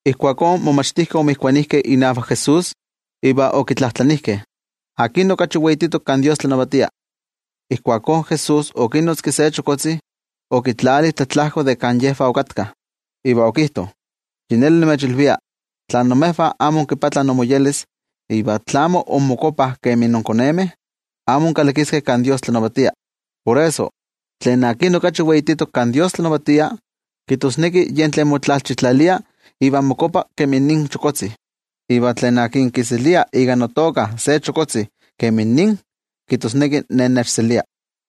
Ijkuakó in momachtijkeh omotokijkeh inavak Jesús, iva okitlajtlanijkeh: —¿Akin okachi weititok kan Dios tlanavatia? Ijkuakó Jesús okinotzki se chokotzi, okitlali tlatlajko de kan yejvah okatkah, iva okijto: —Yi neli nimechilvia, tla imejvah amo inmoyolkuapah iva tla amo inmokuapah kemi inkonemeh, amo inkalakiskeh kan Dios tlanavatia. Por eso, tlen okachi weititok kan Dios tlanavatia, kijtosneki yen tlen motlalchitlalia iva mokuapa kemi nin chokotzi. Iva tlen kiselia ika notoka se chokotzi kemi nin, kijtosneki Ne nechselia.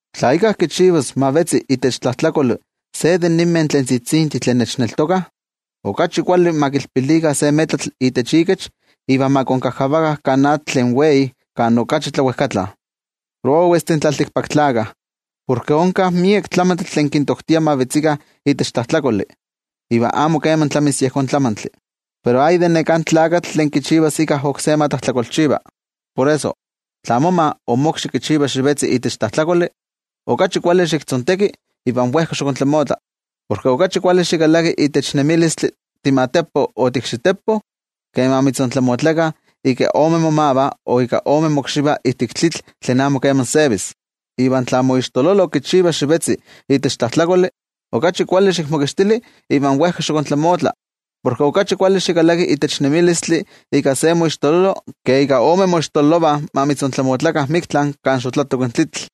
’Tla íkka kichivas ma vetzi itech tlajtlakoli se de ninmeh tzitzintih tlen nechneltokah, okachi kuali ma kilpilikah se metlatl itech ikech iva ma konkajkavakah kan atl tlen wei kan okachi tlawejkatla. Prowestih in tlaltikpaktlakah porke onka miek tlamantli tlen kintoktia ma vetzikah itech tlajtlakoli. Iva amo keman tlamis yejón tlamantli. Pero ¡ay de neká tlakatl tlen kichivas íkka oksé ma tlajtlakolchiva! ’Por eso, tla moma o mokxi kichiva xivetzi itech tlajtlakoli, okachi kuali xiktzonteki iva wejka xiktlamotla. Porke okachi kuali xikalaki itech nemilistli timatepo o tiikxitepo, ke ma mitzontlamotlakah ika ome momavah o ika ome mokxivah ijtik tlitl tlen amo keman sevis. Iva tla moixtololo kichiva xivetzi itech tlajtlakoli, okachi kuali xikmokixtili iva wejka xiktlamotla. Porke okachi kuali xikalaki itech nemilistli ika se moixtololo, ke ika ome moixtololovah ma mitzontlamotlakah miktla kan xotlatok in tlitl.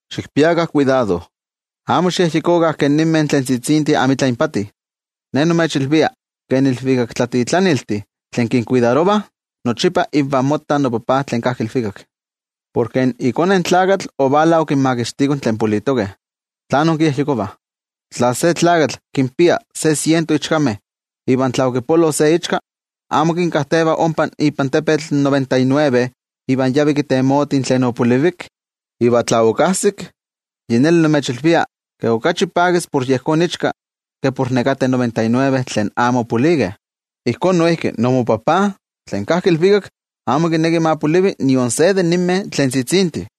’¡Xikpiakah kuidado! Amo xikyejyekokah ke ninmeh tzitzintih amitla inpati. Ne nimechilvia, ke in ilvikaktlatitlaniltih tlen kinkuidarovah nochipa ivan mottah noTajtzi tlen kajki ilvikak. Porke iKone in Tlakatl ovala okinmakixtiko tlen politokeh. ’¿Tlán inkiyejyekovah? Tla se tlakatl kinpia se siento ichkameh, iva tla okipolo se iichka, ¿amo kinkajteva ompa ipan tepetl in noventa y nueve iva yavi kitemoti tlen opolivik? Iva tla okajsik, yi neli nimechilvia, ke okachi pakis por yejón ichka, ke por nekateh noventa y nueve tlen amo opolikeh. Ijkó noijki imoTajtzi tlen kajki ilvikak amo kineki ma polivi nion se de ninmeh tzitzintih.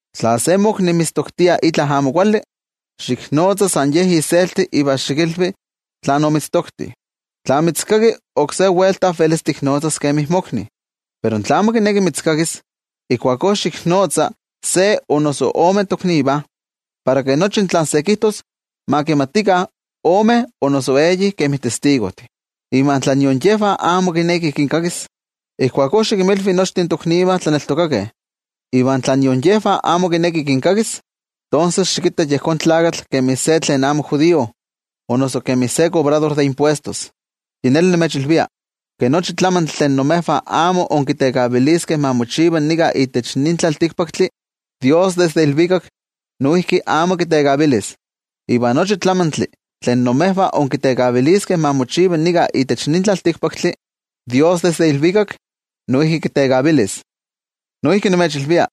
’Tla se mokni mitztoktia itla amo kuali, xiknotza san ye iselti iva xikilvi tlen omitztokti. Tla mitzkaki, oksé welta velis tiknotzas kemi mokni. Pero tla amo kineki mitzkakis, ijkuakó xiknotza se o noso ome toknivah, para ke nochi tlen se kijtos ma kimatikah omeh o noso eyih kemi testigojtih. Iva tla nion yejvah amo kineki kinkakis, ijkuakó xikinmilvi nochtin toknivah tlaneltokakeh. Iva tla nion yejvah amo kineki kinkakis, tonses xikitta yejón tlakatl kemi se tlen amo judío o noso kemi se kobrador de impuestos. ’Yi neli nimechilvia, ke nochi tlamantli tlen imejvah amo inkitekaviliskeh ma mochiva nika itech nin tlaltikpaktli, Dios desde ilvikak noijki amo kitekavilis. Iva nochi tlamantli tlen imejvah inkitekaviliskeh ma mochiva nika itech nin tlaltikpaktli, Dios desde ilvikak noijki kitekavilis. ’Noijki nimechilvia,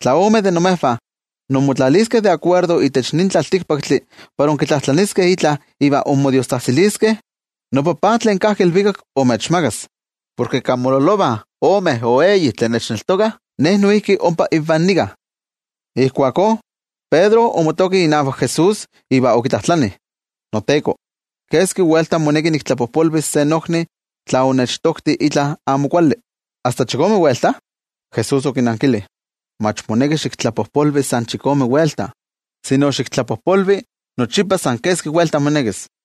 tla ome de imejvah inmotlaliskeh de akuerdo itech nin tlaltikpaktli para inkitlajtlaniskeh itla iva inmodiostzajtziliskeh, noTajtzi tlen kajki ilvikak imechmakas. Porke kan mololovah omeh o eyih tlen nechneltokah, Ne noijki ompa invah nika. Ijkuakó Pedro omotoki inavak Jesús iva okitlajtlani: —NoTeko, ¿keski welta moneki niktlapojpolvis se nokni tla onechtokti itla amo kuali? ¿Asta chikome welta? Jesús okinankili: —Mach moneki xiktlapojpolvi san chikome welta, sino xiktlapojpolvi nochipa san keski welta monekis.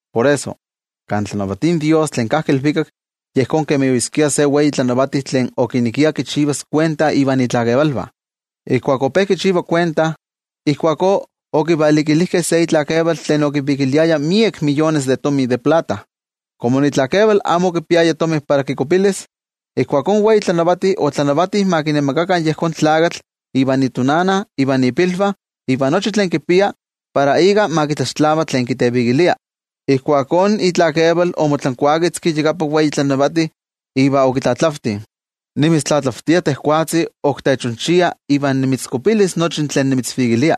’Por eso, kan tlanavatia in Dios tlen kajki ilvikak yejón kemi oyeskia se wei tlanavati tlen okinekia kichivas kuenta ivan itlakevalvah. Ijkuak ope kichiva kuenta, ijkuakó okivalikilijkeh se itlakeval tlen okivikiliaya miek miyones de tomi de plata. Komo itlakeval amo okipiaya tomi para kikuapilis, ijkuakó in wei tlanavati otlanavati ma kinemakakah yejón tlakatl ivan itonana, ivan ipilvah, iva nochi tlen kipia, para ika ma kitlaxtlava tlen kitevikilia. Ijkuakó itlakeval omotlankuaketzki iyakapan wei tlanavati iva okitlatlavti: “Nimitztlatlavtia tejwatzi, ok techonchia iva nimitzkuapilis nochi tlen nimitzvikilia.”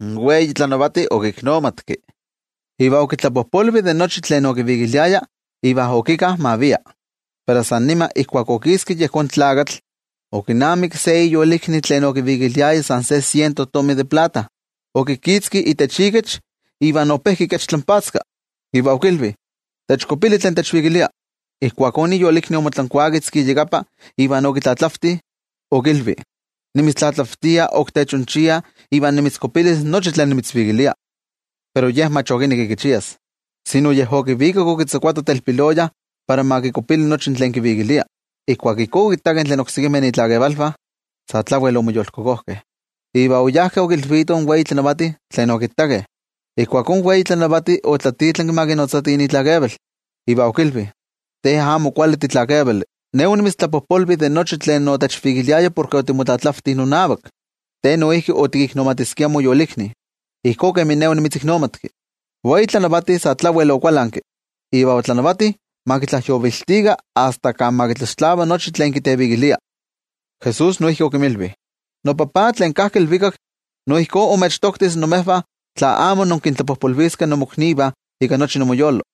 In wei tlanavati okiknomatki, iva okitlapojpolvi de nochi tlen okivikiliaya iva okika ma via. Pero san nima ijkuak okiski yejón tlakatl, okinamikki se iyolikni tlen okivikiliaya san se siento tomi de plata. Okikitzki itech ikech iva ope kikechtlanpatzka, iva okilvi: “¡Techkuapili tlen techvikilia!” Ijkuakó iyolikni omotlankuaketzki iyakapa iva okitlatlavti, okilvi: “Nimitztlatlavtia ok techonchia iva nimitzkuapilis nochi tlen nimitzvikilia.” Pero ye mach okinekki kichias, sino yej okivikak okitzakuato telpiloya para ma kikuapili nochi tlen kivikilia. Ijkuak ijkó okittakeh tlen oksekimeh itlakevalvah, sa tlawel omoyolkokojkeh. Iva oyajkeh okilvitoh in wei tlanavati tlen okittakeh. Ijkuakó in wei tlanavati otlatitlanki ma kinotzatih itlakeval, iva okilvi: “¡Te amo kuali titlakevali! Ne onimitztlapojpolvi de nochi tlen otechvikiliaya porke otimotlatlavti nonavak. Te noijki otikiknomatiskia moyolikni, ijkó kemin ne onimitziknomatki.” In wei tlanavati sa tlawel okualanki, iva otlanavati ma kitlajyoviltikah asta kan ma kitlaxtlava nochi tlen kitevikilia. Jesús noijki okinmilvi: —NoTajtzi tlen kajki ilvikak, no ijkó imechtoktis imejvah tla amo inkintlapojpolviskeh imoknivah ika nochi inmoyolo.